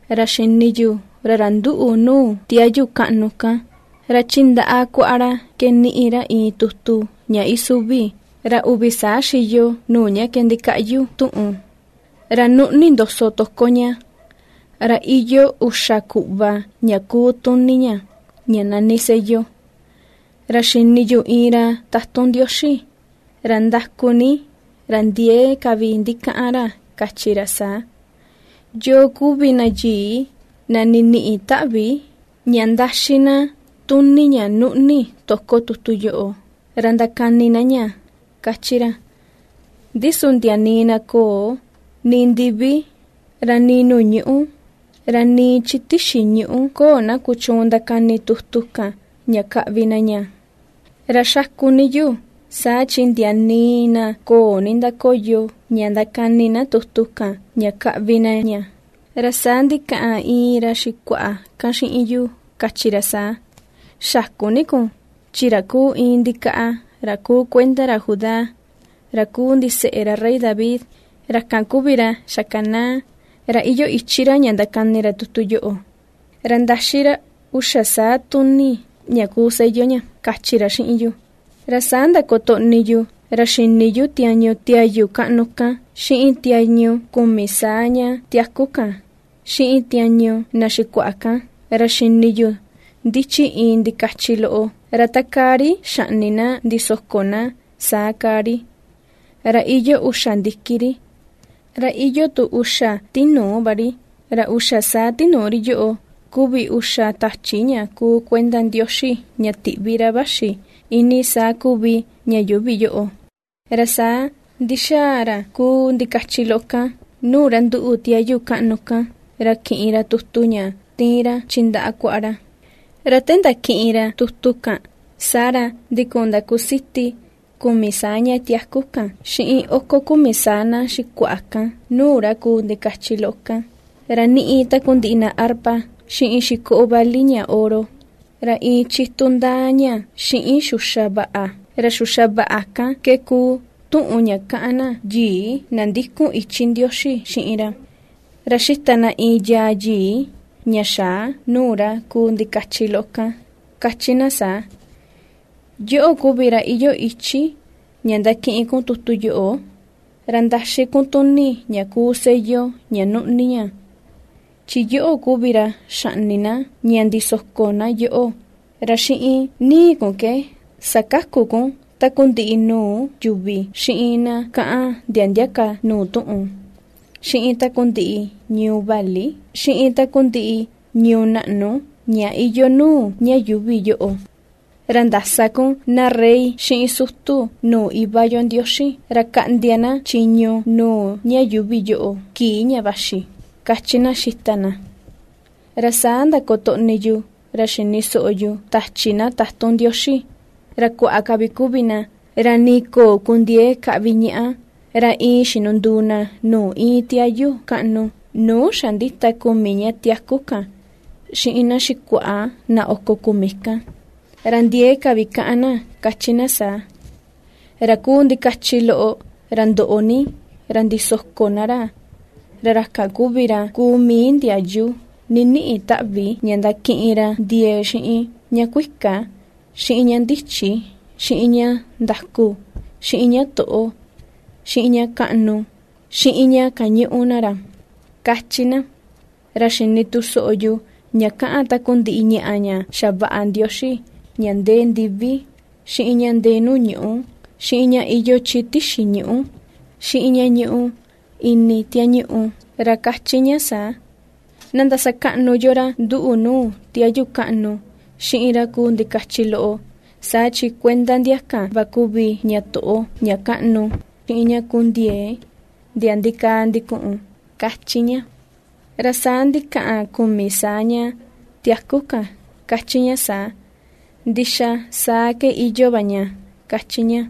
Ra xini yu, ra ra ^nduꞌu nuu tiayu kaꞌnu kan, ra chi ndaꞌa kuaꞌa ra ke ^niꞌi ra iin tutu ña isuvi, ra uvi saa xiyo nuu ña ke ndikaꞌyu tuꞌun, ra nuꞌni ndoso toko ña, ra iyoo uxa kuꞌva ña kuu tuni ña, ña nani sello. Ra xini yu iin ra tatun Ndioxi, ra ndaku ni, ra ndiee ka vi ndikaꞌan ra kachi ra saa: ―¿Yoo kuvi na yii, na niniꞌi taꞌvi, ña ndaxí na tuni ña nuꞌni toko tutu yoꞌo, ra ndakani na ña? ―^kachi ra. Ndi su ndia nii na köo, nii ndivi, ra nii nuu ñuꞌu, ra nii chi tixi ñuꞌu köo na kuchuun ndakani tutu kan, ña kaꞌvi na ña. Ra ^xaku ni yu, saa chi ndia nii na köo nindakoyo ña ndakani na tutu kan ña kaꞌvi na ña. Ra saa ndikaꞌan iin ra xikuaꞌa kan xiꞌin yu kachi ra saa: ―Xäku ni kun chi ra kuu iin ndikaꞌa ra ku kuenda ra Judá, ra kuu ndiseꞌe ra Rey David, ra kan kuvi ra xakanaa, ra iyoo ichi ra ña ndakani ra tutu yoꞌo, ra ndaxí ra uxa saa tuni ña kuu sello ña ―kachi ra xiꞌin yu. Ra saa ndakotoꞌni yu ra xini yu tiañu tiayu kaꞌnu kan, xiꞌin tiañu kumi saa ña tiaku kan, xiꞌin tiañu na xikuaꞌa kan, ra xini yu ndichi iin ndikachi loꞌo, ra takaa ri xaꞌni na ndisoko na, saa kaa ri; ra iyoo uxa ndiki ri, ra iyoo tu uxa tinuu va ri; ra uxa saa tinuu ri yoꞌo kuvi uxa tachi ña kuu kuenda Ndioxi ña tiꞌvi ra vaxi iinii saa kuvi ña yuuvi yoꞌo. Ra saa ndixaa ra kuu ndikachi loꞌo kan nuu ra ^nduꞌu tiayu kaꞌnu kan, ra kiꞌin ra tutu ña ^tiin ra chi ndaꞌa kuaꞌa ra. Ra te ndakiꞌin ra tutu kan, saa ra ndikun ndakusiti kumi saa ña tiaku kan xiꞌin oko kumi saa na xikuaꞌa kan nuu ra kuu ndikachi loꞌo kan, ra ^niꞌi takundiꞌi na arpa xiꞌin xikoo vali ña oro, ra iin chitu ndaa ña xiꞌin xuxa vaꞌa; ra xuxa vaꞌa kan ke kuu tuꞌun ña kaꞌan na yii na ndikun ichi Ndioxi xiꞌin ra. Ra ^xita na iin yaa yii, ña xaa, nuu ra kuu ndikachi loꞌo kan, ^kachi na saa: Yoꞌo kuvi ra iyoo ichi ña ndakiꞌin kun tutu yoꞌo, ra ndaxi kun tuni ña kuu sello ña nuꞌni ña; chi yoꞌo kuvi ra xaꞌni na, ña ndisoko na yoꞌo, ra xiꞌin ni̱i̱ kun ke sakaku kun takundiꞌi nuu yuvi, xiꞌin na kaꞌan ndia ndia ka nuu tuꞌun, xiꞌin takundiꞌi ñuu vali, xiꞌin takundiꞌi ñuu naꞌnu ña iyoo nuu ña yuuvi yoꞌo. Ra ndasa kun na rey xiꞌin sutu nuu Iva yo Ndioxi ra kaꞌndia na chiñu nuu ña yuuvi yoꞌo kii ña vaxi ^kachi na ^xita na. Ra saa ndakotoꞌni yu ra xini soꞌo yu tachi na tatun Ndioxi, ra kuaa ka vi kuvi na, ra nii köo kundiee kaꞌvi ñaꞌa, ra iin xinunduu na nuu íin tiayu kaꞌnu, nuu xa ^ndita kumi ña tiaku kan xiꞌin na xikuaꞌa na oko kumi kan. Ra ndiee ka vi kaꞌan na ^kachi na saa: Ra kuu ndikachi loꞌo, ra ndoꞌo ni, ra ndisoko na ra Ra ra kan kuvi ra ku mii ndiayu niniꞌi taꞌvi ña ndakiꞌin ra ndiee xiꞌin ña kuika, xiꞌin ña ndichi, xiꞌin ña ndaku, xiꞌin ña toꞌo, xiꞌin ña kaꞌnu, xiꞌin ña kañuꞌu na ra, ^kachi na. Ra xini tu soꞌo yu ña kaꞌan takundiꞌi ñaꞌa ña xavaꞌa Ndioxi ña ndee ndivi, xiꞌin ña ndee nuu ñuꞌu, xiꞌin ña iyoo chi tixi ñuꞌu, xiꞌin ña ñuꞌu ini tiañuꞌu, ra ^kachi ña saa: Na ndasakaꞌnu yo ra ^nduꞌu nuu tiayu kaꞌnu xiꞌin ra kuu ndikachi loꞌo saa chin kuenda ndia kan va kuvi ña toꞌo, ña kaꞌnu, xiꞌin ña ku ndiee ndia ndikaa ndikuꞌun, ^kachi ña. Ra saa ndikaꞌan kumi saa ña tiaku kan ^kachi ña saa: ―¡Ndixa, saa ke iyoo va ña! ―kachi ña.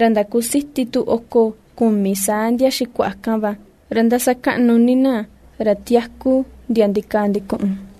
Ra ndakusiti tu oko kumi saa ndia xikuaꞌa kan va, ra ^ndasakaꞌnu ni na ra tiaku ndiaa ndikaa ndikuꞌun.